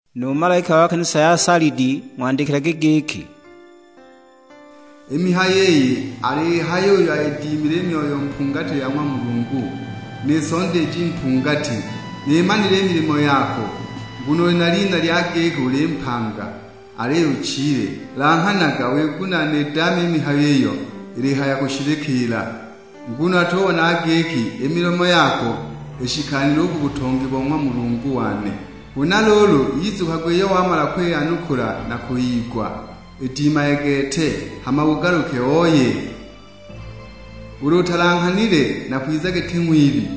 "Nu malaika wa kanisa ya Salidi ng'wandikilage giki, 'I mihayo iyi aliyihaya uyo ayidimile i Myoyo mpungati ya ng'wa Mulungu, ni Sonda iji mpungati: Nimanile i milimo yako, nguno uli na lina lya giki uli mpanga, aliyo uchile! Langhanaga wigunaane idaame i mihayo iyo ilihaya kushililikiila. Nguno natubonaga giki i milimo yako ishikanile u ku butongi bo ng'wa Mulungu wane. Huna luulu, yizukagwe iyo wamala kwiyanukula na kwiyigwa, idimage gete, hama ugaluke ooye. Ulu utalanghanile nakwiza giti ng'wibi;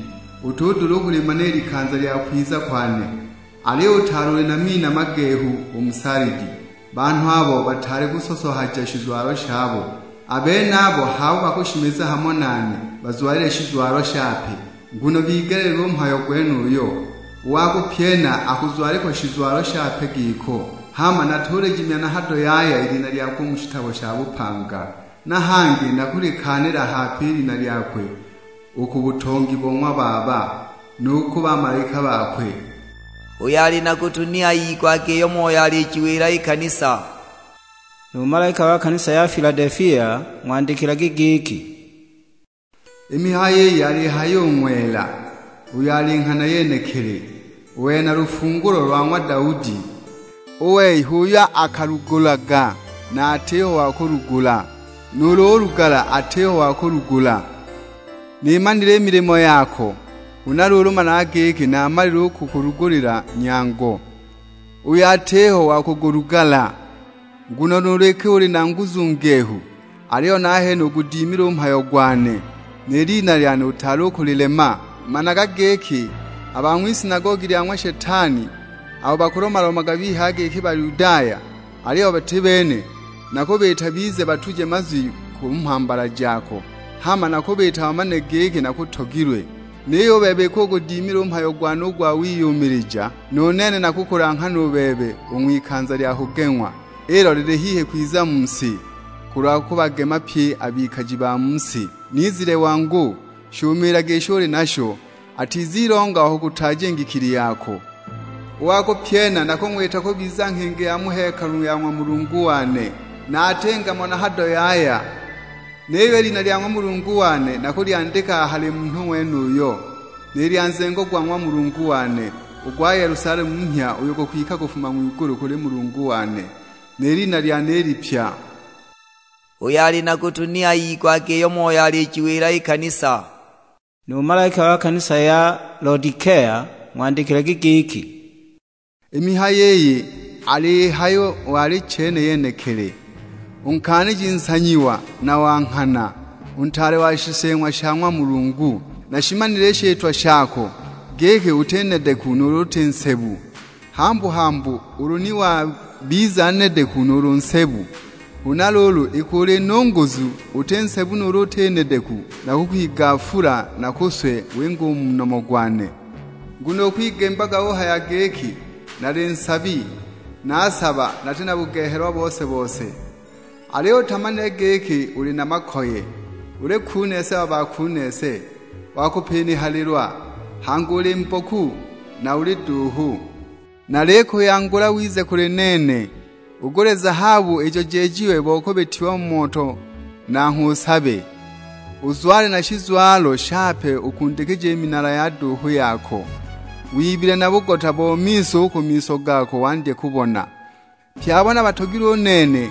utudula u kulimana i likanza lya kwiza kwane. Aliyo utaali uli na mina magehu u mu Salidi, banhu abo bataali kusosohaja shizwalo shabo. A benabo h'abo bakushimiza hamo nane bazwalile shizwalo shape, nguno bigeleelilwe u mhayo gwenuyo. U wa kupyena akuzwalikwa shizwalo shape giko, hama natulijimya na hado yaya i lina lyakwe u mu shitabo sha bupanga; na hangi nakulikaanila hape i lina lyakwe u ku butongi bo ng'wa Baba, nu ku bamalaika bakwe. Uyo ali na gutu ni ayigwage iyo Moyo alijiwila i kanisa.' "Nu malaika wa kanisa ya Filadelifia ng'wandikilage giki, 'I mihayo iyi aliyihaya u ng'wela, uyo ali Nghana yenekili; uyo ali na lufungulo lwa ng'wa Daudi. U wei h'uyo akalugulaga na atiho wa kulugala; nuulu ulugala atiho wa kulugula: Nimanile i milimo yako, huna luulu managa giki naamalile kukulugulila nyango, uyo atiho wa kugulugala; nguno nuulu iki uli na nguzu ngehu, aliyo nahene ugudimile u mhayo gwane; ni lina lyane utaali u kulilema! Managa giki a ba ng'wisinagogi lya ng'wa Shetani, abo bakulomalomaga bihaya giki Bayudaya aliyo bati bene, nakubiita bize batuje mazwi ku mhambala jako; hama nakubiita bamane giki nakutogilwe. Niyo u bebe iki ugudimile u mhayo gwane u gwa wiyumilija, nu nene nakukulanghana u bebe u ng'wikanza lya kugeng'wa, ilo lili hihi kwiza mu si, kulwa kubagema pye a bikaji ba mu si. Nizile wangu, shumiilage isho uli nasho, atizilonga wa kukutaaja i ngikili yako. U wa kupyena nakung'wita kubiza nghingi ya mu hekalu ya ng'wa Mulungu wane, na atinga mo na hado yaya; niyo i lina lya ng'wa Mulungu wane nakulyandika a hali munhu ng'wenuyo, ni lya nzengo go ng'wa Mulungu wane, u gwa Yelusalemu mhya uyo gukwika kufuma ng'wigulu kuli Mulungu wane, ni lina lyane i lipya. Uyo ali na gutu ni ayigwage iyo Moyo alijiwila i kanisa.' "Nu malaika wa kanisa ya Lodikea ng'wandikilage giki, 'I mihayo iyi aliyihaya u Alichene yenekili, u Nkaaniji nsanyiwa na wa nghana, u Ntaale wa shiseeng'wa sha ng'wa Mulungu: Nashimanile i shitwa shako, giki uti nedeku nuulu uti nsebu; hambu-hambu ulu ni wabiza nedeku nuulu nsebu. Huna luulu iki uli nunguzu, uti nsebu nuulu uti nedeku, nakukwigafula nakuswe winge u mu nomo gwane! Nguno ukwigimbaga uhaya giki, "Nali nsabi, naasaba nati na bugehelwa bose-bose!" Aliyo utamanile giki uli na makoye, uli kunese wa bakunese wa kupinihalilwa; hangi uli mboku, na uli duuhu! Nalikuyangula wize kuli nene, ugule zahabu ijo jejiwe bo kubitiwa mu moto nangho usabe; uzwale na shizwalo shape ukundikije i minala ya duuhu yako, wibile na bugota bo miso u ku miso gako wandye kubona. Pye abo nabatogilwe u nene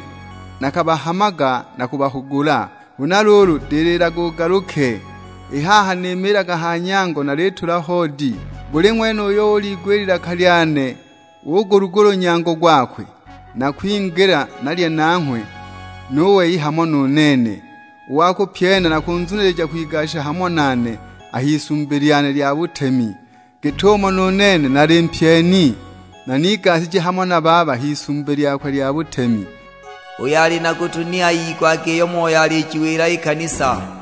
nakabahamaga na kubahugula, huna luulu dililaga ugaluke. I haha nimiilaga ha nyango nalitula hoodi; buli ng'wene uyo uliigwa i lilaka lyane ugulugula u nyango gwakwe, nakwingila nalye nanghwe, nu wei hamo nu nene. U wa kupyena nakunzunilija kwigasha hamo nane a h'Isumbi lyane lya butemi; git'umo nu nene nali mpyeni na nigashije hamo na Baba h'Isumbi lyakwe lya butemi. Uyo ali na gutu ni ayigwage iyo Moyo alijiwila I kanisa.' "